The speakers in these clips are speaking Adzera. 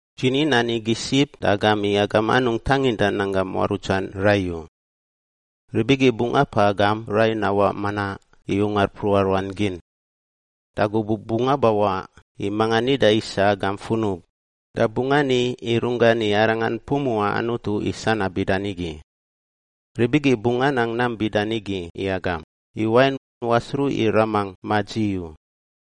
“Dzi ni nan igi sib da agam i agam anungꞌ tanginda nanggam muarutsan rai u. Rib igi bungꞌ apaꞌ agam rai nawaꞌ manaꞌ i ungar mpruꞌa ruan gin. Da gubuꞌ bungꞌ awaꞌ i manga nida isa agam funub da bungꞌ ani i runggan i arangan pumuꞌa Anutu i sanab bida nigi. Rib igi bungꞌ anang nam bida nigi i agam, i wain wasruꞌ i Ramangꞌ ma dzi u.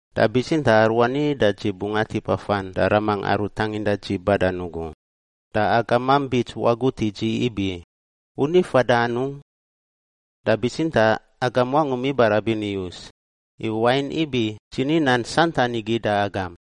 Da bitsintaꞌ aruani da dzi bungꞌ atip afan da Ramangꞌ aru tanginda dzi badan ugu, da agamam bits wagut i dzi ibi, ‘U ni fada anungꞌ?’ Da bitsintaꞌ agam wangum ibarabin iyus, i wain ibi dzi ni nan santan igi da agam.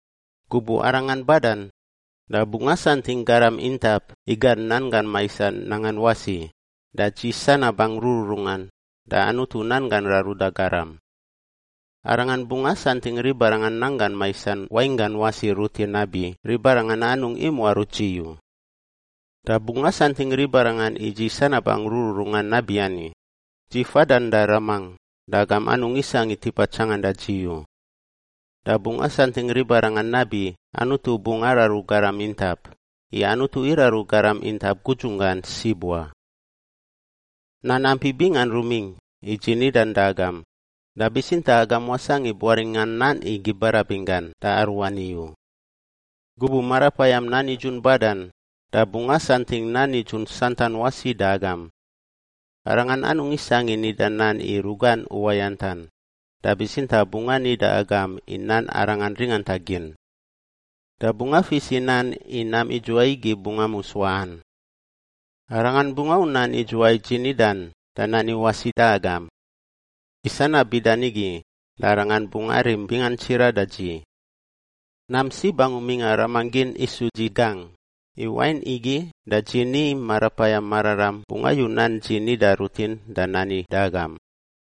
Gubuꞌ Arangan badan, da bungꞌ asantingꞌ garam intap i gan nanggan maisan nangan wasi, da dzi sanabangꞌ rururungan, da Anutu nanggan raruda garam. Arangan bungꞌ asantingꞌ ribarangan nanggan maisan wainggan wasi rutin nabi ribarangan anungꞌ imuaruts dzi u. Da bungꞌ asantingꞌ ribarangan i dzi sanabangꞌ rururungan nabiani, dzi fadan da Ramangꞌ da agam anungꞌ isangꞌ i tipa tsanganda dzi u. Da bungꞌ asantingꞌ ribarangan nabi Anutu bungꞌ araru garam intap, i Anutu iraru garam intap gudzunggan sib wa. “Nan ampi bingan rumingꞌ i dzi nidan da agam, da bitsintaꞌ agam wasangꞌ i buaringꞌa nan igi barabin gan da aruani u. Gubuꞌ Marapayam nan nidzun badan da bungꞌ asantingꞌ nan nidzun santan wasi da agam. Arangan anungꞌ isangꞌ i nida nan i rugan uwayantan; da bitsintaꞌ bungꞌ ani da agam i nan Arangan ringanta gin. Da bungꞌ afis i nan i nam idzuwai igi bungꞌ amus waꞌan. Arangan bungꞌ au nan idzuwai dzi nidan da nani wasi da agam. I sanab bida nigi da Arangan bungꞌ arim bingan tsiraꞌ da dzi. Nam sib angu mingꞌa Ramangꞌ gin isu dzi gangꞌ, i wain igi da dzi ni i Marapayam Mararam bungꞌ ayu nan dzi nida rutin da nani da agam.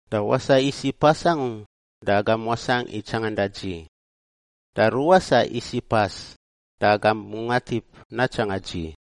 “Da wasaꞌ isiꞌ pas angu da agam wasangꞌ i tsanganda dzi, da ruwasaꞌ isiꞌ pas da agam bungꞌ atip natsanga dzi.”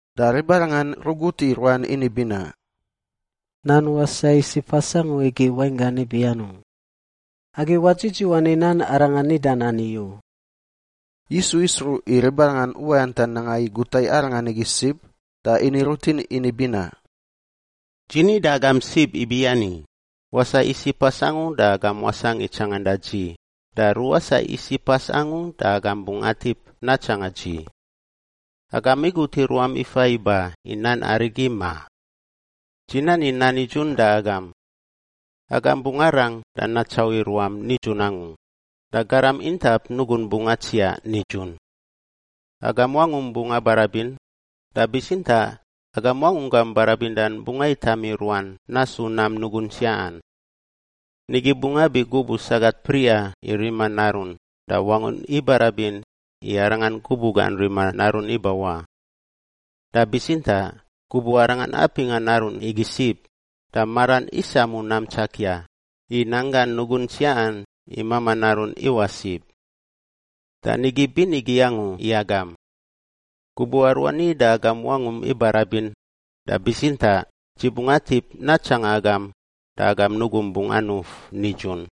Da ribarangan rugut i ruan ini binaꞌ, “Nan ‘wasaꞌ isiꞌ pas angu’ igi wainggan ibi anungꞌ? Agi wadzidziwan i nan Arangan nidan ani u.” Yisu isruꞌ i ribarangan uwayantan nanga i guta i Arangan igi sib da ini rutin ini binaꞌ, “Dzi ni da agam sib ibiani, ‘Wasaꞌ isiꞌ pas angu da agam wasangꞌ i tsanganda dzi da ruwasaꞌ isiꞌ pas angu da agam bungꞌ atip natsanga dzi.’ Agam igut i ruam ifa iba i nan arigi, ma? Dzi nani nan nidzun da agam! Agam bungꞌ arang da natsauꞌ i ruam nidzun angu, da garam intap nugun bungꞌ atsiaꞌ nidzun. Agam wangum bungꞌ abarabin, da bitsintaꞌ agam wangunggam barabindan bungꞌ aitam i ruan nasu nam nugun tsiaꞌan. Nigi bungꞌ abi gubuꞌ sagat priꞌa i rima narun da wangun ibarabin i arangan gubuꞌ gan rima narun ibawaꞌ. Da bitsintaꞌ gubuꞌ arangan apingꞌa narun igi sib, da maran isamu nam tsakia, i nanggan nugun tsiaꞌan i mamaꞌ narun iwaꞌ sib. Da nigi binigi angu i agam! Gubuꞌ aruani da agam wangum ibarabin, da bitsintaꞌ dzi bungꞌ atip natsanga agam da agam nugum bungꞌ anuf nidzun.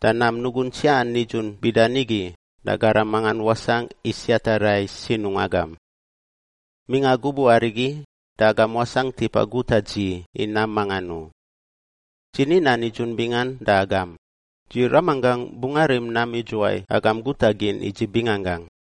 Da nam nugun tsiaꞌan nidzun bida nigi da garam mangan wasangꞌ i siata rai sinungꞌ agam. Mingꞌa gubuꞌ arigi da agam wasangꞌ tipa guta dzi i nam mangan u. Dzi ni nan nidzun bingan da agam, dzi Ramanggangꞌ bungꞌ arim nam idzuwai agam guta gin i dzi binganggangꞌ.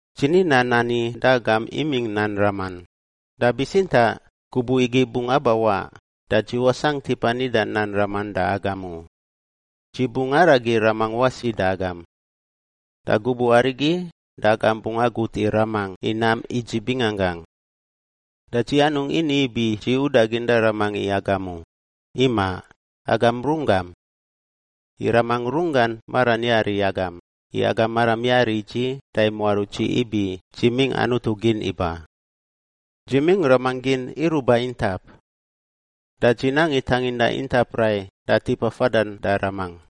“Dzi ni nan ani da agam imingꞌ nan raman, da bitsintaꞌ gubuꞌ igi bungꞌ abawaꞌ da dzi wasangꞌ tipa nida nan raman da agam u; dzi bungꞌ aragi Ramangꞌ wasi da agam. Da gubuꞌ arigi da agam bungꞌ agut i Ramangꞌ i nam i dzi binganggangꞌ. Da dzi anungꞌ ini ibi dzi udagin da Ramangꞌ i agam u; imaꞌ, agam runggam. I Ramangꞌ runggan maran yari i agam, i agam maram yari i dzi da imuaruts dzi ibi dzi imingꞌ Anutu gin iba. Dzi mingꞌ Ramangꞌ gin iruꞌ ba intap. Da dzi nang i tanginda intap rai da tipa fadan da Ramangꞌ.”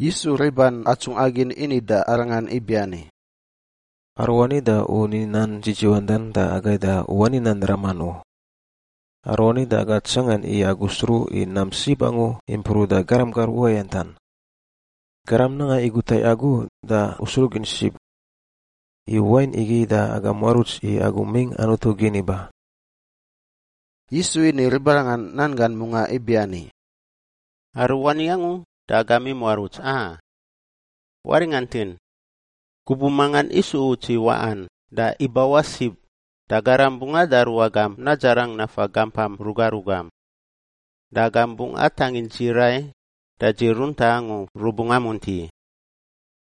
Yisu riban atsungꞌa gin ini da Arangan ibiani, “Aruani da U ni nan dzidziwandan da agai da U wani nan raman u. Aruani da aga tsangan i Agu sruꞌ i nam sib angu impruꞌ da garam gar uwayantan. Garam nanga i guta i Agu, da U sruꞌ gin sib. I wain igi da aga muaruts i Agu mingꞌ Anutu gin iba.” Yisu ini ribarangan nan gan mungaꞌ ibiani, “Aruani angu da agam imuaruts, a? Waringantin! Gubuꞌ mangan isu uts i waꞌan da ibawaꞌ sib, da garam bungꞌ adaru agam nadzarang nafa gampam ruga rugam. Da agam bungꞌ atangin dzi rai da dzi runtaꞌ angu rubungꞌ amunti.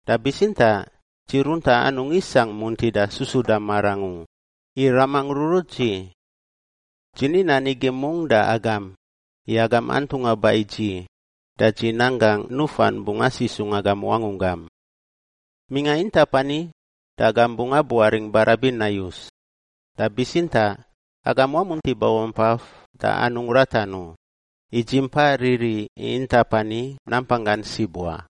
Da bitsintaꞌ dzi runtaꞌ anungꞌ isangꞌ muntida susuda marangꞌ u, i Ramangꞌ rurut dzi. Dzi ni nan igi mungꞌ da agam, i agam antungꞌa ba i dzi da dzi nan gangꞌ nufan bungꞌ asisungꞌ agam wangunggam. Mingꞌa intap ani da agam bungꞌ abuaringꞌ barabin nayus, da bitsintaꞌ agam wamunti babampaf da anungꞌ ratan u, i dzi mpa riri i intap ani nampanggan sib wa.”